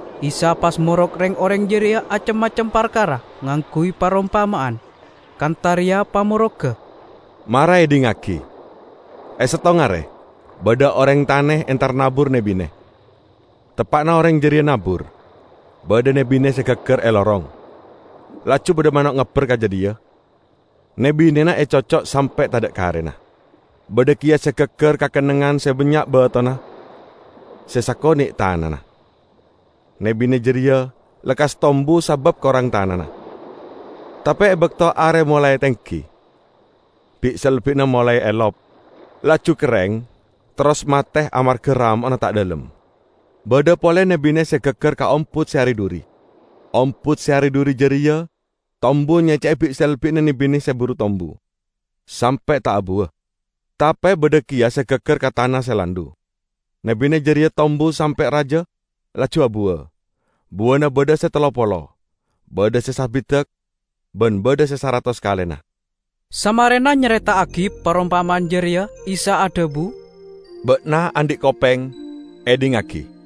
Isa pas morok reng-oreng jareya acem-macem parkara ngangguy parompama'an. Kantha reya pamorogga: "Mara edhingngagi! E settong are badha oreng tane entar nabur ne-bine. Teppa'na oreng jareya nabur, badha ne-bine se gaggar e lorong. Laju badha mano' ngabber ka jadhiya, ne-binena ecocco' sampe' tadha' karena. Badha keya se gaggar ka kennengngan se bannya' batona se sakone' tanana. Ne-bine jareya lekkas tombu sabab korang tanana, tape e bakto are molae tenggi, bi'-selbi'na molae elop, laju kerreng terros mate amarga ramo'na ta' dhalem. Badha pole ne-bine se gaggar ka ombut se ari-dhuri. Ombut se ari-dhuri jareya tombu nyecce'e bi'-selbi'na ne-bine se buru tombu, sampe' ta' abuwa. Tape badha keya se gaggar ka tana se landhu. Ne-bine jareya tombu, sampe' raja, laju abuwa. Buwana badha se tello polo, badha se sabidak, ban badha se saratos kalena." Samarena nyareta'agi parompama'an jareya Isa adhabu, "Ba'na andhi' kopeng, edhingngagi!"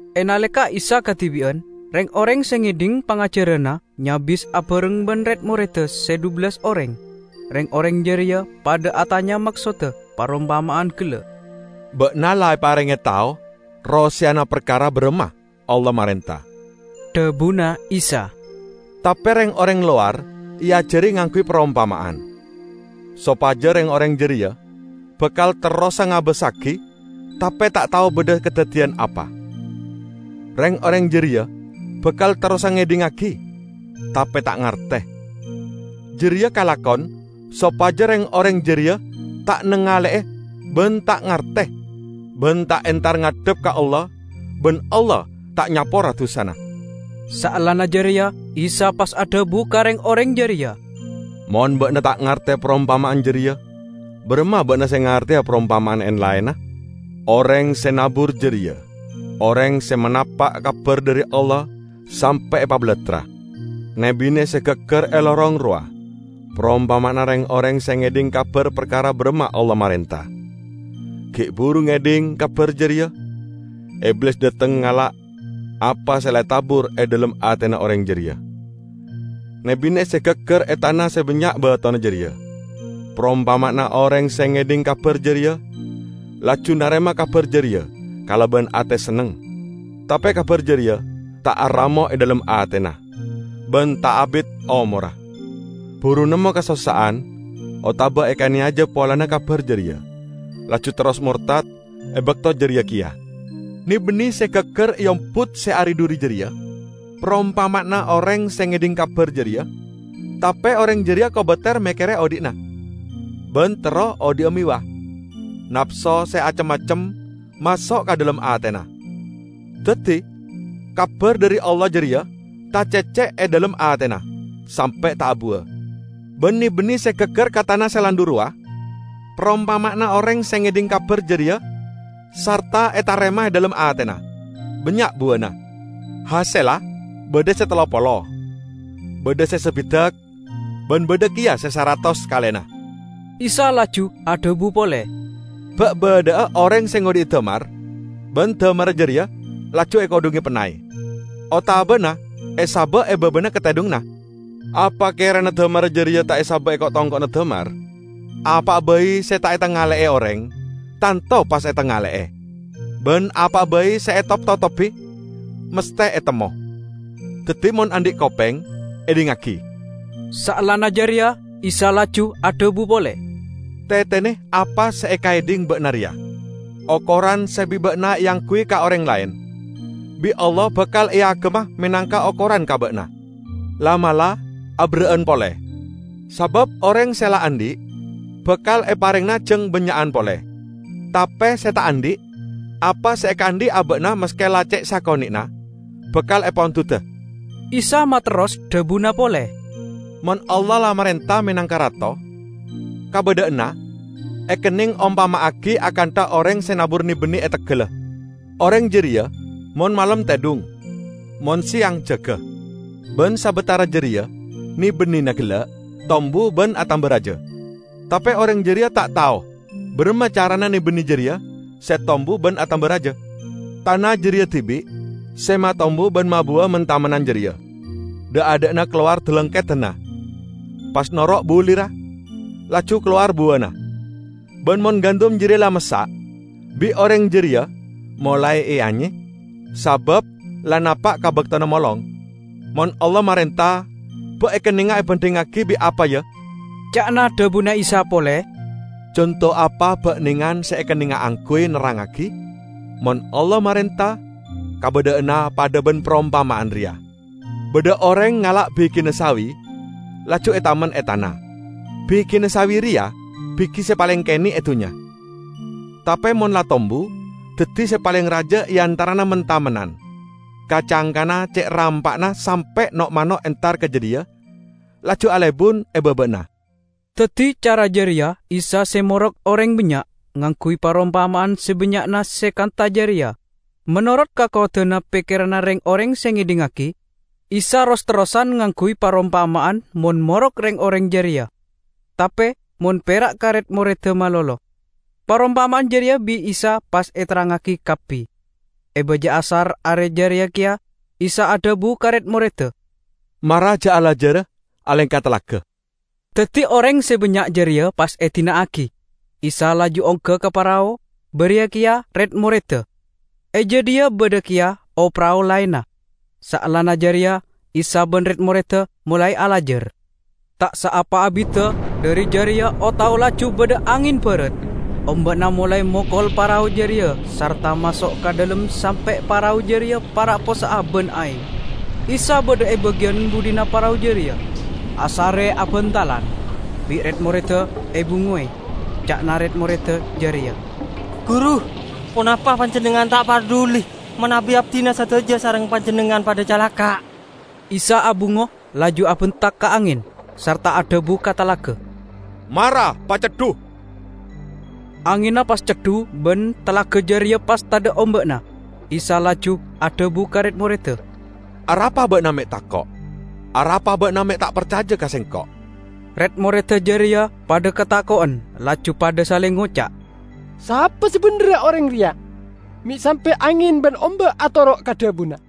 E naleka Isa kadibi'an, reng-oreng se ngedhing pangajaranna nyabis abareng ban red-moredda se dhubellas oreng. Reng-oreng jareya padha atanya maksodda parompama'an gella'. "Ba'na la eparenge tao roseyana parkara baramma Allah marenta," dhabuna Isa. "Tape reng-oreng lowar eajari ngangguy parompama'an, sopaja 'Reng-oreng jareya bakal terrosa ngabassagi tape ta' tao badha kadaddiyan apa, reng-oreng jareya bakal terrosa ngedhingngagi, tape ta' ngarte, jareya kalakon sopaja reng-oreng jareya ta' nangale'e ban ta' ngarte ban ta' entar ngadhep ka Allah ban Allah ta' nyapora dusana.' " Saellana jareya Isa pas adhabu ka reng-oreng jareya, "Mon ba'na ta' ngarte parompama'an jareya, baramma ba'na se ngarteya parompama'an en-laenna? Oreng se nabur jareya oreng se manapa' kabar dhari Allah sampe' epabalattra. Ne-bine se gaggar e lorong rowa parompama'anna reng-oreng se ngedhing kabar parkara baramma Allah marenta. Gi' buru ngedhing kabar jareya, Iblis dhateng ngala' apa se la etabur e dhalem atena oreng jareya. Ne-bine se gaggar e tana se bannya' batona jareya parompama'anna oreng se ngedhing kabar jareya, laju narema kabar jareya kalaban ate senneng. Tape kabar jareya ta' aramo' e dhalem atena, ban ta' abit omorra. Buru nemmo kasossa'an otaba ekaneyaja polana kabar jareya, laju terros mortad e bakto jareya keya. Ne-bine se gaggar e ombut se ari-dhuri jareya parompama'anna oreng se ngedhing kabar jareya, tape oreng jareya kobater mekkere odhi'na, ban terro odhi'a mewah, napso se acem-macem maso' ka dhalem atena. Daddi kabar dhari Allah jareya tacecce' e dhalem atena, sampe' ta' abuwa. Ban ne-bine se gaggar ka tana se landhu rowa parompama'anna oreng se ngedhing kabar jareya sarta etarema e dhalem atena, bannya' buwana. Hasella badha se tello polo, badha se sabidak, ban badha keya se saratos kalena." Isa laju adhabu pole, "Ba' badha'a oreng se ngodhi'i damar ban damarra jareya laju ekodhunge pennay, otabana esaba' e babana katedhunganna? Apa kerana damarra jareya ta' esaba' e ko'-tongko'na damar? Apa'a bai se ta' etangale'e oreng tanto pas etangale'e, ban apa'a bai se etop-totobi masthe etemmo. Daddi, mon andhi' kopeng, edhingngagi!" Saellana jareya Isa laju adhabu pole, "Tetene apa se ekaedhing ba'na reya! Okoran se bi' ba'na eangguy ka oreng laen, bi' Allah bakal eagemma menangka okoran ka ba'na, la'-mala' aberra'an pole. Sabab oreng se la andhi', bakal eparengngana jang bannya'an pole; tape se ta' andhi', apa se ekaandhi' aba'na maske la ce' sakone'na bakal epondhuda." Isa materros dhabuna pole, "Mon Allah la marenta menangka rato, kabadha'anna ekenneng ompama'agi akantha oreng se nabur ne-bine e teggalla. Oreng jareya mon malem tedhung, mon seyang jaga. Ban sabatara jareya ne-binena gella' tombu ban atamba raja. Tape oreng jareya ta' tao baramma carana ne-bine jareya se tombu ban atamba raja. Tana jareya dibi' se matombu ban mabuwa men-tamennan jareya; dha'-adha'na kalowar dalangkedanna, pas noro' bulirra, laju kalowar buwana. Ban mon gandum jareya la massa', bi' oreng jareya molae eanye sabab la napa' ka baktona molong." "Mon Allah marenta, ba' ekennenga bandhingngagi bi' apa, ya?" ca'na dhabuna Isa pole. "Conto apa ba'nengan se ekennenga angguy nerrangngagi? Mon Allah marenta, kabadha'anna padha ban parompama'an reya: Badha oreng ngala' bigina sawi laju etamen e tana. Bigina sawi reya bigi se paleng kene' e dunnya. Tape mon la tombu, daddi se paleng raja e antarana men-tamennan. Ka-cangkana ce' rampa'na sampe' no'-mano' entar ka jadhiya laju alebun e baba'anna." Daddi cara jareya Isa se morok oreng bannya', ngangguy parompama'an sabannya'na se kantha jareya, menorot kakowadanna pekkeranna reng-oreng se ngedhingngagi. Isa ros-terrosan ngangguy parompama'an mon morok reng-oreng jareya, tape mon pera' kare red-moredda malolo, parompama'an jareya bi' Isa pas eterrangngagi kabbi. E baja asar are jareya keya, Isa adhabu ka red-moredda, "Mara ja' alajara alengka talaga." Daddi oreng se bannya' jareya pas edina'agi. Isa laju ongga ka parao, bariya keya red-moredda. E jadhiya badha keya o-parao laenna. Saellana jareya Isa ban red-moredda molae alajar. Ta' saapa abidda dhari jareya o-tao laju badha angen barat. Omba'na molae mokol parao jareya sarta maso' ka dhalem sampe' parao jareya para' possa'a ban aeng. Isa badha e bagiyan budhina parao jareya, asare abantalan. Bi' red-moredda ebungowe. Ca'na red-moredda jareya, "Guru, ponapa Panjennengngan ta' parduli manabi abdina sadaja sareng Panjennengngan padha calaka'?" Isa abungo, laju abentak ka angen, sarta adhabu ka talaga, "Mara paceddu!" Angenna pas ceddu ban talaga jareya pas tadha' omba'na. Isa laju adhabu ka red-moredda, "Arapa ba'na me' tako'? Arapa ba'na me' padha ta' parcaja ka Sengko'?" Red-moredda jareya padha katako'en laju padha saleng ngoca', "Sapa sabendherra oreng reya? Me' sampe' angen ban omba' atoro' ka dhabuna"